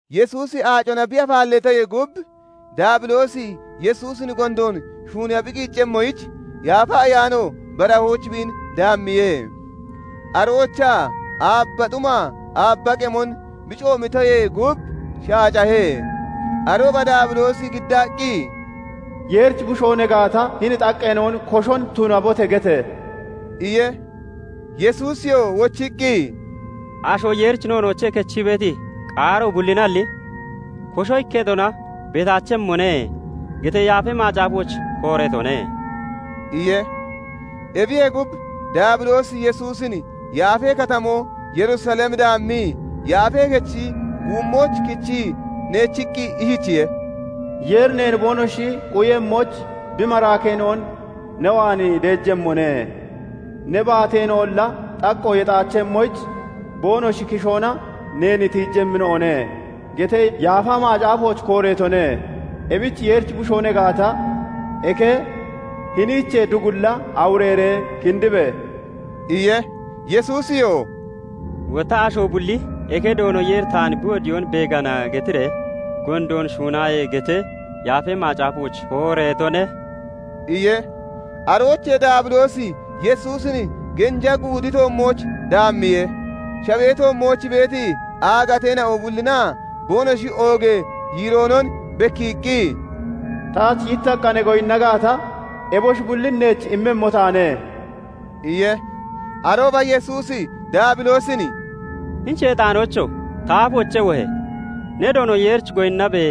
Yesuusi aacona bi afaalleetoyee gub, Daabiloosi Yesuusin gondoon shuuniiya bi qiiccemmoyich, Yaafa Ayaano barahooch biin daammiye. Aroochaa aabaa xumaa aabba qemon bi coomitoyee gub shaacahe. Arooba Daabiloosi giddaqqi, "Yeerichi Bushoo ne gaata, hini xaqqeena'on 'Koshon tunabote!' gete!" iye. Yesuusiyoo wochiqqi, " 'Asho Yeerichi noonoochee kechii beeti qaaro bullinalli, kosho ikketona beetaachemmone' getee Yaafa Macaafooch kooreetone" iye. Ebiyee gub, Daabiloosi Yesuusin yaafee katamoo Yerusalem daammii, Yaafee Kechi guummooch kichii neechiqqi ishichiye:- " 'Yeeri neen boonoshi quyemmoyich bi maraakeena'on ne waan deejemmone; ne baatoonolla xaqqo bi yexaachemmoyich, boonoshi kishoona neen tiijemmina'one' getee Yaafa Macaafooch kooreetone. Ebich Yeerichi Bushoo ne gaata, eke, hiniichee dugulla awureeree kindibe!" iye. Yesuusiyoo "Wotta 'Asho bulli "Eke, Doono Yeeri taan bi wodiyoon beegana" getiree gondoon shuunaaye' getee Yaafa Macaafooch kooreetone" iye. Aroochee Daabiloosi Yesuusin genja guudi toommooch daammiye; shawee toommooch beeti aagateena'o bullinaa boonoshi oogee yiiroonon bekkiiqqi, "Taach yittaqqa ne goyinna gaata, eboshi bullin neech immemmo taane" iye. Arooba Yesuusi Daabiloosin "Hini Sheexaanoocho! Ta aafoochee wohe! 'Ne Doono Yeerich goyinnabe!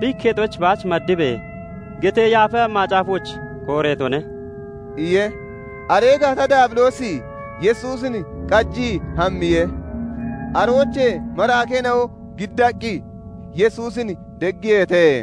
Bi ikketoyich baach maddibe (madaabe)!' getee Yaafa Macaafooch kooreetone" iye. Aree gaata Daabiloosi Yesuusin qajii hammiye. Aroochee maraakeena'o giddaqqi Yesuusin deggiyeete.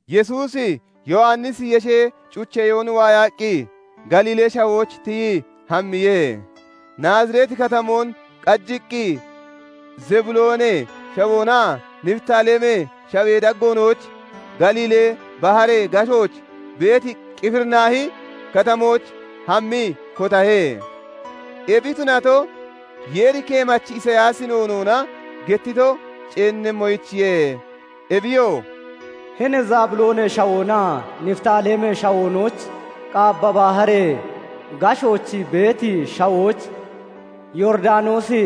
Yesuusi Yowannisi yeshee cucheyoon waayaqqi Galiilee Shawooch tiyii hammiye. Nazareti Katamoon qajiqqi Zebuloonee Shawoonaa Nifitaalemee Shawee daggoonooch Galiilee Baharee gashooch beeti Qifirinaahi Katamooch hammii kotahe. Ebi tunato, Yeeri keemachi Isiyaasi noonoona gettito ceennemmoyichiye; ebiyoo "Hini Zebuloonee Shawoonaa Nifitaalemee Shawoonooch, Qaabba Baharee gashooch beeti shawooch, Yooridanoosi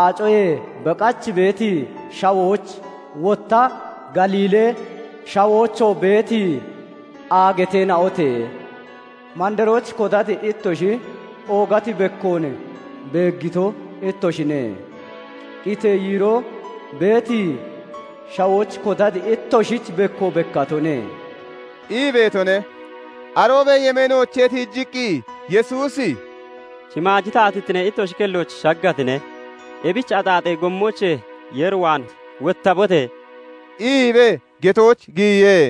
Aacoyee beqach beeti shawooch, Wotta Galiilee Shawoochoo beeti aagateena'ote! Mandarooch kotati ittoshi oogati bekkoon beeggito ittoshine; qitee yiiroo beeti shawooch kotati ittoshich bekko bekkatone" ii beetone. Aroobee yemeenoochee tiijiqqi Yesuusi "Shimaaji taatittinee ittoshi kellooch shaggatine; ebich axaaxee gommoochee Yeer waan wottabote!" iibee getooch giyiye.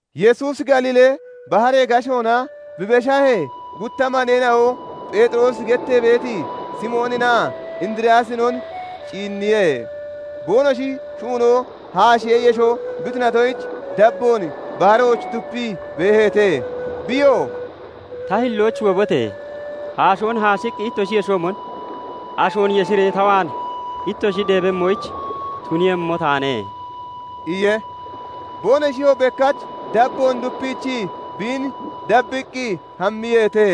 Yesuusi Galiilee baharee gashoona bi beshahee, gutta maneena'o Pheexiroosi gettee beeti Simooninaa Indiriyaasinon ciinniye; boonoshi shuunoo haashee yesho bi tunatoyich dabboon baharooch dupii beeheete. Biyoo "Ta hillooch wobote! Haashoon hashiqqi ittoshi yeshoomon ashoon yeshiree ta waan ittoshi deebemmoyich tuniiyemmo taanee" iye. Boonoshiyoo bekkach dabboon dupiichii biin dabbiqqi hammiyeete.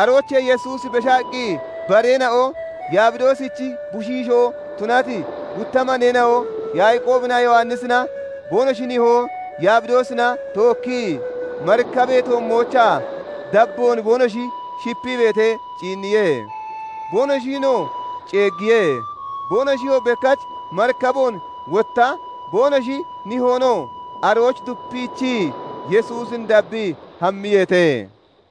Aroochee Yesuusi beshaqqi bareena'o Yabidoosichi bushiishoo tunati gutta maneena'o Yaaqoobinaa Yowannisina boonoshi nihoo Yabidoosina tookkii marikabee toommoochaa dabboon boonoshi shipii beetee ciinniye; boonoshinoo ceeggiye. Boonoshiyoo bekkach marikaboon, wotta boonoshi nihoonoo arooch dupiichii Yesuusin dabbii hammiyeete.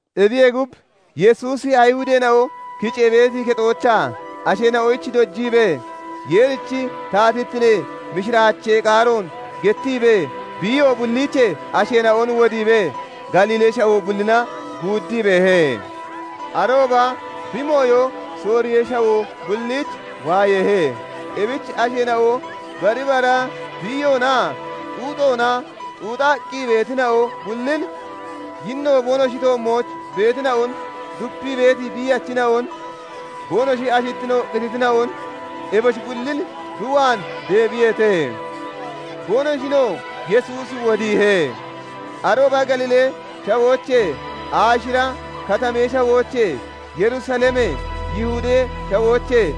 Ebiyee gub, Yesuusi Ayihudeena'o kicee beeti kexoochaa asheena'oyich dojiibee, Yeerichi taatittinee mishiraachee qaaroon gettiibee, biiyo bulliichee asheena'on wodiibee, Galiilee Shawoo bullina guuddii beehe. Arooba bi mooyo Sooriyee Shawoo bulliich waayeehe. Ebich asheena'o bari bara biiyoonaa xuuxoona xuuxaqqi beetina'o bullin, yinno boonoshi toommooch beetina'on, dupii beeti biiyachina'on, boonoshi ashittino qititina'on eboshi bullin bi waan deebiyeete; boonoshinoo Yesuusi wodiihe. Arooba Galiilee Shawoochee, Aashira Katamee Shawoochee, Yerusalemee, Yihudee Shawoochee,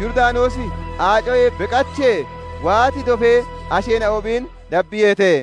Yooridanoosi Aacoyee beqachee waati dofee asheena'o biin dabbiyeete.